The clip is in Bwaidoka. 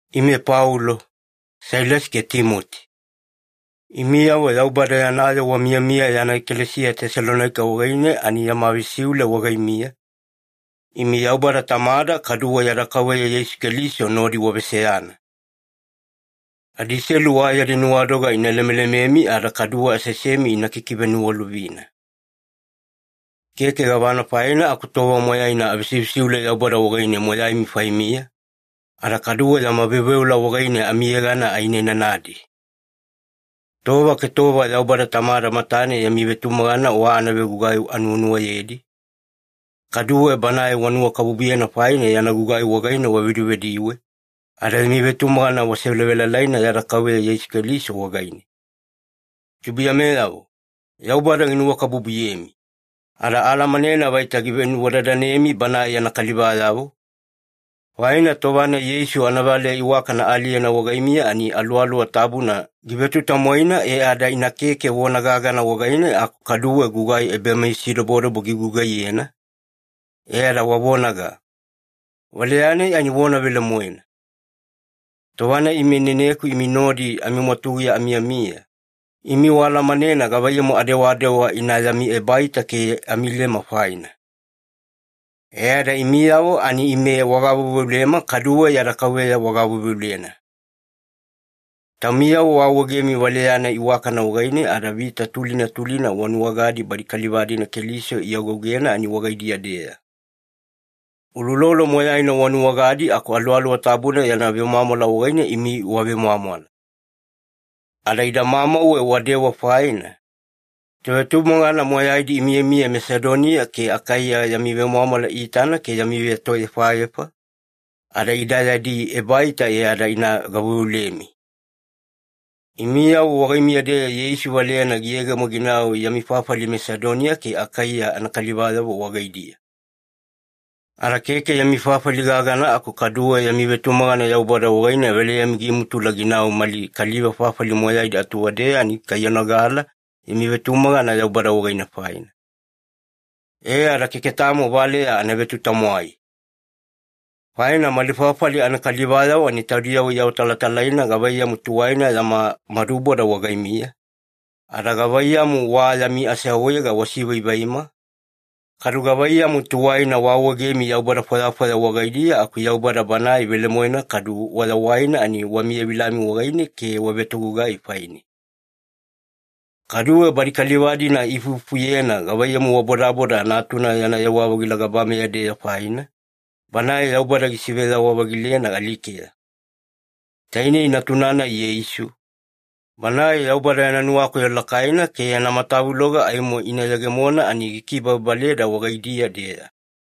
Ime Paulo, Sailasi ke Timoti. Imiyavo Yaubada yana yoo wamiyamiya yana ekalesiya Tesalonaika wagaine ani yama vesiule wagaimiya, imi Yaubada Tamada kaduwe yada Kauveya Yeisu Keliso nodi waveseyana. Adiselu wa yadi nuwadoga ina lemelememi ada kaduwe aseasemi ina kikiveniwalovina. Keke gavana faina aku tova moyaina avesivesiule Yaubada wagaine moyaimi faimiya, ada kaduwe yama veoveola wagaine amiyegana ainainanadi. Tova ke tova Yaubada Tamada matane yami vetumagana wa anagugai anuwanuwayedi, kaduwe Banae wanuwakabubuyena faina yana gugai wagaine wavedivediwe, ada yami vetumagana wasevelavelaina yada Kauveya Yeisu Keliso wagaine. Tubuiyameyavo, Yaubada ginuwakabubuyemi. Ada aalamanena vaita givenuwadadanemi Banae yana kalivayavo, faina tova-nai Yeisu anavaleya iwakana aaliyena wagaimiya ani Aluwaluwa Tabuna givetutamwaina, e ada ina keke vona gagana wagaine aku kaduwe gugai ebameyasidobodobo gigugaiyena, e ada wavonaga, “Valeya-nai ani vona velemoena.” Tova-nai ime ineneku imi nodi amimwatuguya amiyamiya, imi waalamanena gavaiyamu adewadewa ina yami ebaita ke amilema faina. E ada imiyavo ani ime wagaveuveulema kaduwe yada Kauveya wagaveuveulena. Taumiyavo waawaegemi valeya-nai iwakana wagaine ada vita tulina tulina wanuwagadi badi kaliva-dina Keliso iagougena ani wagaidiya-deya. Uloulolo moyaina wanuwagadi aku Aluwaluwa Tabuna yana vemwamwala wagaine imi wavemwamwala. Ada idamamauwe wadewa faina, tovetumagana moyaidi imiyamiya Masedoniya ke Akaiya yami vemwamwala iitana ke yami vetoefaefa, ada ida yadi ebaita e ada ina gaveuveulemi. Imiyavo wagaimiya-deya Yeisu valeyana giyegemo ginau yami fafali Masedoniya ke Akaiya anakalivayavo wagaidiya. Ada keke yami fafali gagana, aku kaduwe yami vetumagana Yaubada wagaine valeyami gimutula ginau mali kaliva fafali moyaidi atuwadeya ani ikaiyanogala yami vetumagana Yaubada wagaine faina. E ada keke tamo valeya ana vetutamwai. Faina mali fafali anakalivayavo ani taudiyavo iawatalatalaina gavaiyamu tuwaina yama maduboda wagaimiya, ada gavaiyamu wa yami aseawaega wasivaivaima, kadu gavaiyamu tuwaina waawaegemi yaubada fwayafwaya wagaidiya aku Yaubada Banae velemoena kadu wayawaina ani wamiyavilami wagaine ke wavetogugai faine. Kaduwe badi kaliva-dina iifuifufuyena gavaiyamu wabodaboda Natuna yana yewa-vagila gabameya-deya faina, Banae Yaubada gisiveyawa-vagilena alikeya. Tainei Natuna-nai Yeisu, Banae Yaubada yana nuwakoyo lakaina ke yana matavuloga aimo ina yegemona ani gikibababaleda wagaidiya-deya.